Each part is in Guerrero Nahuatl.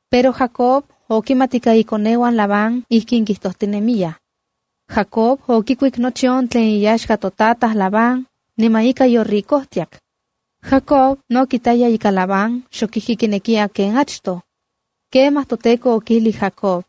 Pero Jacob okimat ika ikoneuan Labán ijkin kijtojtinemiyaj: “Jacob okikuik nochi on tlen iyaxka totataj Labán, niman ika yoricojtiak.” Jacob no kitaya ika Labán xok ijki kinekiya ken achtoj. Kemaj toTEKO okijlij Jacob: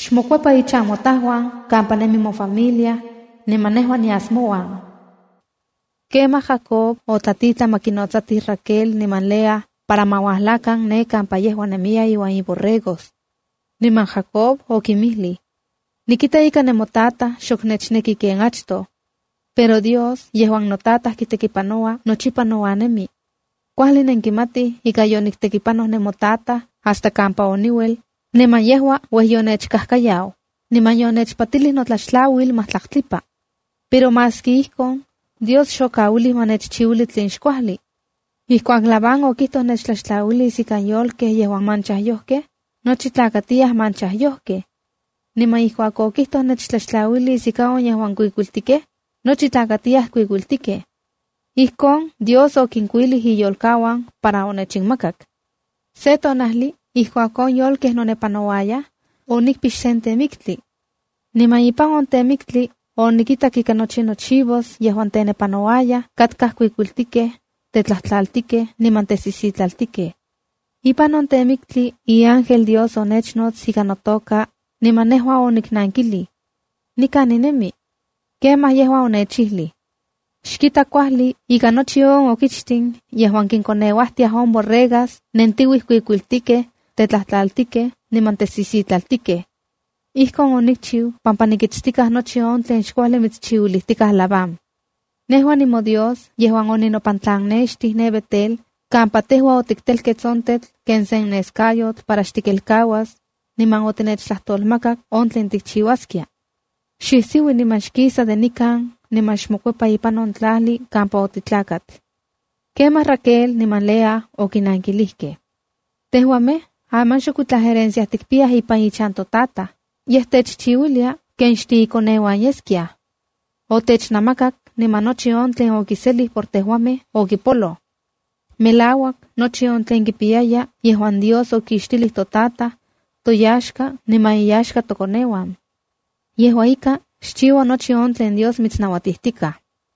“Xmokuepa inchan motauan kampa nemi mofamilia, niman nejua nias mouan.” Kemaj Jacob otlatitlan ma kinnotsatij Raquel niman Lea para ma uajlakan ne kampa yejua nemiya iuan iborregos. Niman Jacob okinmijlij: —Nikita ika nemotataj xok nechneki ken achtoj. Pero Dios yejuan notataj kitekipanoua nochipa nouan nemi. Kuajli nenkimatij ika yoniktekipanoj nemotataj hasta kampa oniuel, niman yejua uej yonechkajkayau, niman yonechpatilij notlaxtlauil majtlaktlipa. Pero maski ijkon, Dios xokauilij ma nechchiuili tlen xkuajli. Ijkuak Labán okijtoj nechtlaxtlauilis ikan yolkej yejuan manchajyojkej, nochi tlakatiyaj manchajyojkej. Niman ijkuak okijtoj nechtlaxtlauilis ika on yejuan kuikuiltikej, nochi tlakatiyaj kuikuiltikej. Ijkon Dios okinkuilij iyolkauan para onechinmakak. Se tonajli ijkuak on yolkej nonepanouayaj, onikpix sen temiktli. Niman ipan on temiktli onikitak ika nochi chivos yejuan tenepanouayaj katkaj kuikuiltikej, tetlajtlaltikej niman tesisitlaltikej. Ipan on temiktli iángel Dios onechnots ikan notoka, niman nejua oniknankilij: “Nikan ninemi.” Kemaj yejua onechijli: “Xkita kuajli ika nochi on okichtin yejuan kinkoneuajtiaj on borregas nentiuij kuikuiltikej, tetlajtlaltikej niman tesisitlaltikej. Ijkon onikchiu pampa nikitstikaj nochi on tlen xkuajli mitschiuilijtikaj Labán. Nejua nimoDios yejuan oninopantlannextij ne Betel kampa tejua otiktelkets on tetl ken sen neskayotl para xtikelkauas, niman otinechtlajtolmakak on tlen tikchiuaskia. ¡Xisiui, niman xkisa de nikan, niman xmokuepa ipan on tlajli kampa otitlakat!” Kemaj Raquel niman Lea okinankilijkej: —Tejuamej aman xokuitlaj herencia tikpiyaj ipan ichan totataj, yej techchiuilia ken xtiikoneuan yeskiaj. Otechnamakak, niman nochi on tlen okiselij por tejuamej okipoloj. Melauak nochi on tlen kipiyaya yejuan Dios okixtilij totataj, toyaxka niman inyaxka tokoneuan. Yejua ika, xchiua nochi on tlen Dios mitsnauatijtikaj.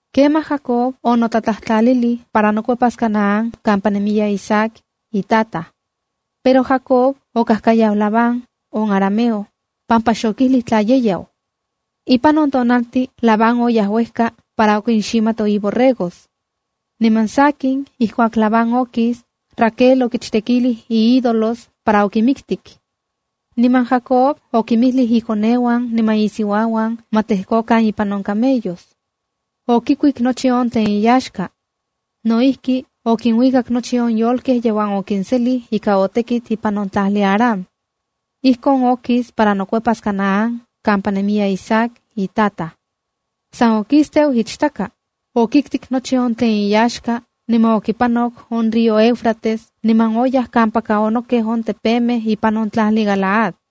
Kemaj Jacob onotlatlajtlalilij para nokuepas Canaán kampa nemiya Isaac itataj. Pero Jacob okajkayau Labán, on arameo, pampa xokijlij tla ye yau. Ipan on tonaltin Labán oyaj uejka para okinximato iborregos. Niman sakin ijkuak Labán okis, Raquel okichtekilij iídolos para okinmiktik. Niman Jacob okinmijlij ikoneuan niman isiuauan ma tlejkokan ipan on camellos. Okikuik nochi on tlen iyaxka. No ijki, okinuikak nochi on yolkej yejuan okinselij ika otekit ipan on tlajli Aram. Ijkon okis para nokuepas Canaán kampa nemiya Isaac, itataj. San okisteu ichtaka, okiktik nochi tlen iyaxka, niman okipanok on río Éufrates niman oyaj kampaka onokej on tepemej ipan on tlajli Galaad.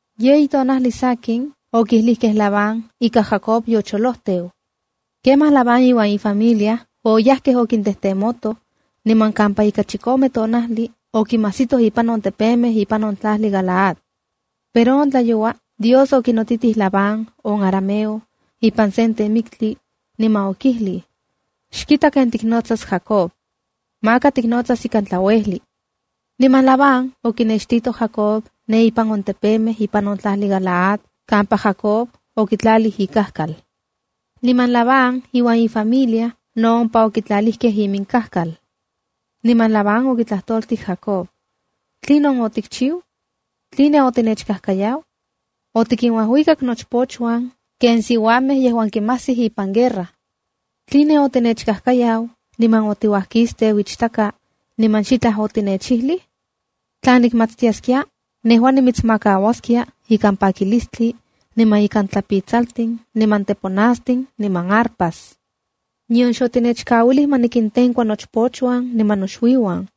Yeyi tonajli sakin, okijlijkej Labán ika Jacob yocholojteu. Kemaj Labán iuan ifamilia oyajkej okintejtemotoj, niman kampa ika chikome tonajli okinmajsitoj ipan on tepemej ipan on tlajli Galaad. Pero on tlayoua Dios okinotitij Labán, on arameo, ipan sen temiktli, niman okijlij: “Xkita ken tiknotsas Jacob. Maka tiknotsas ikan tlauejli.” Niman Labán okinextito Jacob ipan on tepemej ipan on tlajli Galaad kampa Jacob okitlalij ikajkal. Niman Labán iuan ifamilia no ompa okitlalijkej inkajkaluan. Niman Labán okitlajtoltij Jacob: —¿Tlinon otikchiu? ¿Tline otinechkajkayau? ¡Otikinuajuikak nochpochuan ken siuamej yejuan kinmajsij ipan guerra! ¿Tline otinechkajkayau, niman otiuajkisteu ichtaka, niman xitlaj otinechijlij? Tla nikmatiskia, nejua nimitsmakauaskia ikan pakilistli, niman ikan tlapitsaltin, niman teponastin niman arpa. Nion xotinechkauilij ma nikintenkua nochpochuan niman noxuiuan.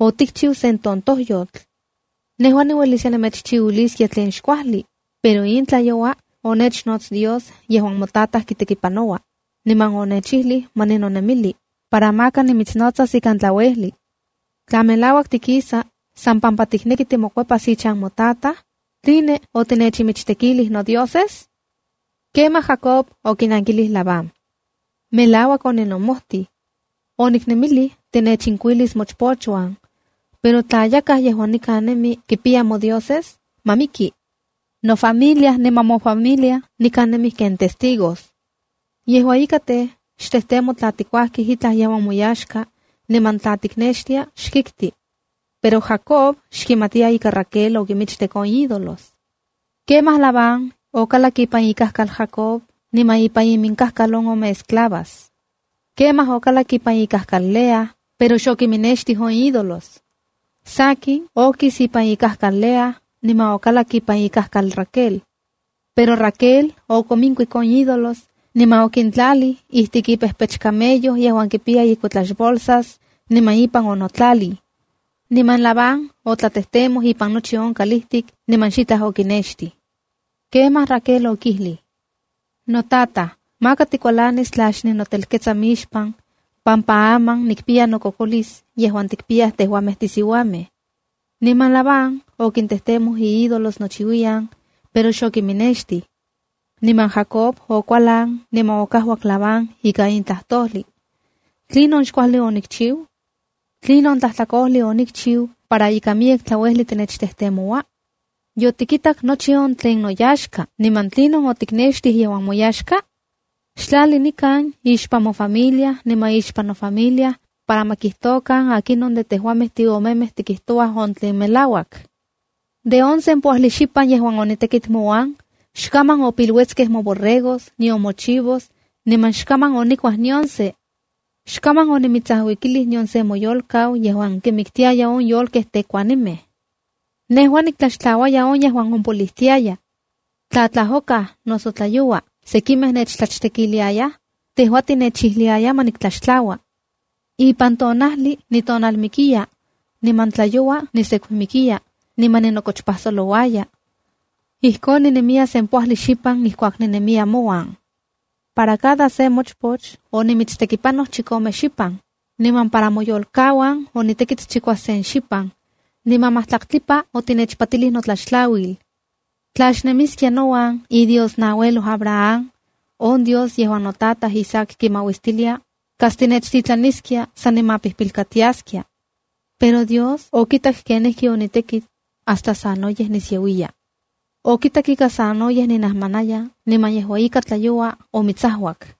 ¡Otikchiu sen tontojyotl! Nejua niueliskia nemechchiuiliskia tlen xkuajli, pero in tlayoua onechnots Dios yejuan motataj kitekipanoua, niman onechijli ma ninonemili, para maka nimitsnotsas ikan tlauejli. Tla melauak tikisa san pampa tikneki timokuepas ichan motataj, ¿tline otinechinmichtekilij nodioses? Kemaj Jacob okinankilij Labán: —Melauak oninomojtij. Oniknemilij tinechinkuilis mochpochuan. Pero tla yakaj yejuan nikan nemi kipiya modioses, ¡ma miki! Nofamila niman mofamilia nikan nemij ken testigos. Yejua ika tej, xtejtemo tla tikuajkij itlaj yejuan moyaxka, niman tla tiknextia xkikti. Pero Jacob xkimatiya ika Raquel okimichtek on ídolos. Kemaj Labán okalak ipan ikajkal Jacob niman ipan iminkajkal on ome esclavas. Kemaj okalak ipan ikajkal Lea, pero xokiminnextij on ídolos. Sakin, okis ipan ikajkal Lea, niman okalak ipan ikajkal Raquel. Pero Raquel okominkuik on ídolos, niman okintlalij ijtik ipejpech camello yejuan kipiya ikuetlaxbolsas, niman ipan onotlalij. Niman Labán otlatejtemoj ipan nochi on kalijtik niman xitlaj okinnextij. Kemaj Raquel okijlij: —Notataj, maka tikualanis tla xninotelketsa mixpan, pampa aman nikpiya nokokolis yejuan tikpiyaj tejuamej tisiuamej. Niman Labán okintejmoj iídolos nochiuiyan, pero xokiminnextij. Niman Jacob okualan niman okajuak Labán ika in tlajtojlij: —¿Tlinon xkuajli onikchiu? ¿Tlinon tlajtlakojli onikchiu para ika miyek tlauejli titechtejtemoua? Yotikitak nochi on tlen noyaxka niman, ¿tlinon otiknextij yejuan moyaxka? ¡Xtlali nikan ixpan mofamilia niman ixpan nofamilia para ma kijtokan akinon de tejuamej tiomemej tikijtouaj on tlen melauak! De on sempoajli xipan yejuan onitekit mouan, xkaman opiluetskej moborregos nion mochivos, niman xkaman onikuaj nion se. Xkaman onimitsajuikilij nion se moyolkau yejuan kimiktiaya on yolkej tekuanimej. Nejua niktlaxtlauaya on yejuan ompoliuiya. Tla tlajokaj noso tlayoua sekimej nechtlachtekiliayaj, tejua tinechijliaya ma niktlaxtlaua. Ipan tonajli nitonalmikiya, niman tlayoua nisekumikiya, niman ninokochpajsolouaya. Ijkon ninemiya sempoajli xipan ijkuak ninemiya mouan. Para cada se mochpoch onimitstekipanoj chikome xipan, niman para moyolkauan onitekit chikuasen xipan. Niman majtlaktlipa otinechpatilij notlaxtlauil. Tla xnemiskia nouan iDios naueloj Abraham, on Dios yejuan notataj Isaac kimauistiliaya, kas tinechtitlaniskia san nimapijpilkatiaskia. Pero Dios okitak kenijkionitekit hasta sanoyej nisiauiya. Okitak ika sanoyej ninajmanaya niman yejua ika tlayoua omitsajuak.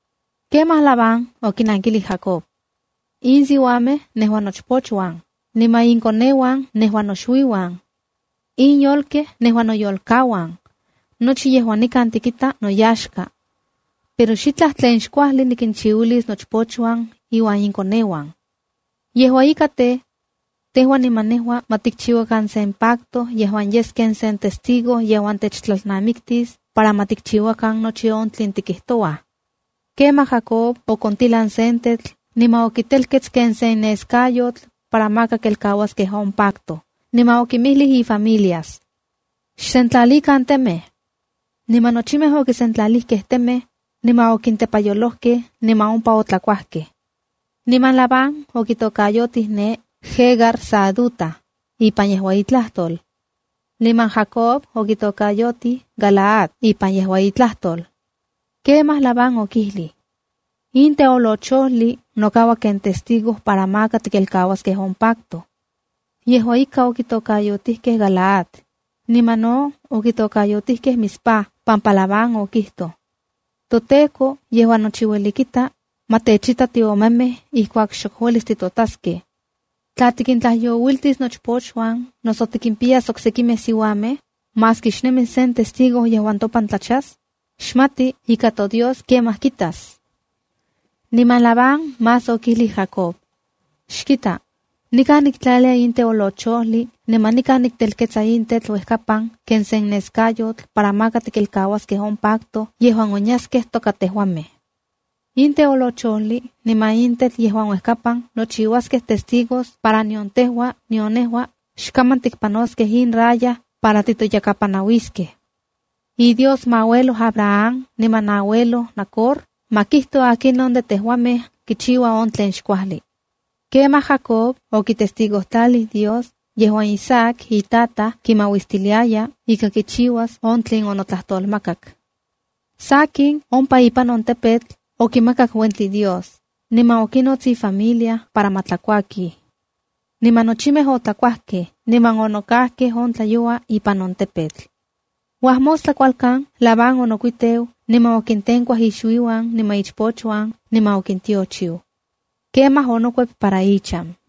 Kemaj Labán okinankilij Jacob: —In siuamej nejua nochpochuan, niman inkoneuan nejua noxuiuan. In yolkej nejua noyolkauan. Nochi yejuan nikan tikita noyaxka. Pero xitlaj tlen xkuajli nikinchiuilis nochpochuan iuan inkoneuan. Aman tej, tejua niman nejua ma tikchiuakan sen pacto yejuan yes ken sen testigo yejuan techtlalnamiktis para ma tikchiuakan nochi on tlen tikijtouaj. Kemaj Jacob okontilan sen tetl niman okitelkets ken sen neskayotl para maka kelkauaskej on pacto, niman okinmijlij ifamilias: —¡Xsentlalikan temej! Niman nochimej okisentlalijkej temej, niman okintepayolojkej, niman ompa otlakuajkej. Niman Labán okitokayotij ompa ne “Jegar Sahaduta” ipan yejua itlajtol. Niman Jacob okitokayotij “Galaad” a ipan yejua itlajtol. Kemaj Labán okijlij: —In teolochojli nokaua ken testigo para maka tikelkauaskej on pacto. Yejua ika, okitokayotijkej Galaad, niman no okitokayotijkej Mizpab pampa Labán okijtoj: —ToTEKO yejuan ueli kitla, ma techita tiomemej ijkuak xok uelis titotaskej. Tla tikintlajyouiltis nochpochuan noso tikimpiyas oksekimej siuamej, maski xnemis sen testigo yejuan topan tlachas, xmati ika toDios kemaj kitas. Niman Labán más okijlij Jacob: —Xkita, nikan niktlalia in teolochojli niman nikan niktelketsa in tetl uekapan ken sen neskayotl para maka tikelkauaskej on pacto yejuan onyaskej toka tejuamej. In teolochojli niman in tetl yejuan uekapan nochiuaskej testigos para nion tejua, nion nejua, xkaman tikpanoskej in raya para titoyakapanauiskej. IDios moauelo Abraham, niman nauelo Nacor, ma kijto akinon de tejuamej kichiua on tlen xkuajli. Kemaj Jacob okitestigojtlalij Dios yejuan Isaac on itataj kimauistiliaya ika kichiuas on tlen onotlajtolmakak. Sakin, ompa ipan on tepetl okimakak uentli Dios, niman okinots ifamilia para ma tlakuakij. Niman nochimej otlakuajkej, niman onokajkej on tlayoua ipan on tepetl. Uajmostla kualkan, Labán onokuiteu, niman okintenkuaj ixuiuan niman ichpochuan, niman okintiochiu. Kemaj onokuep para ichan.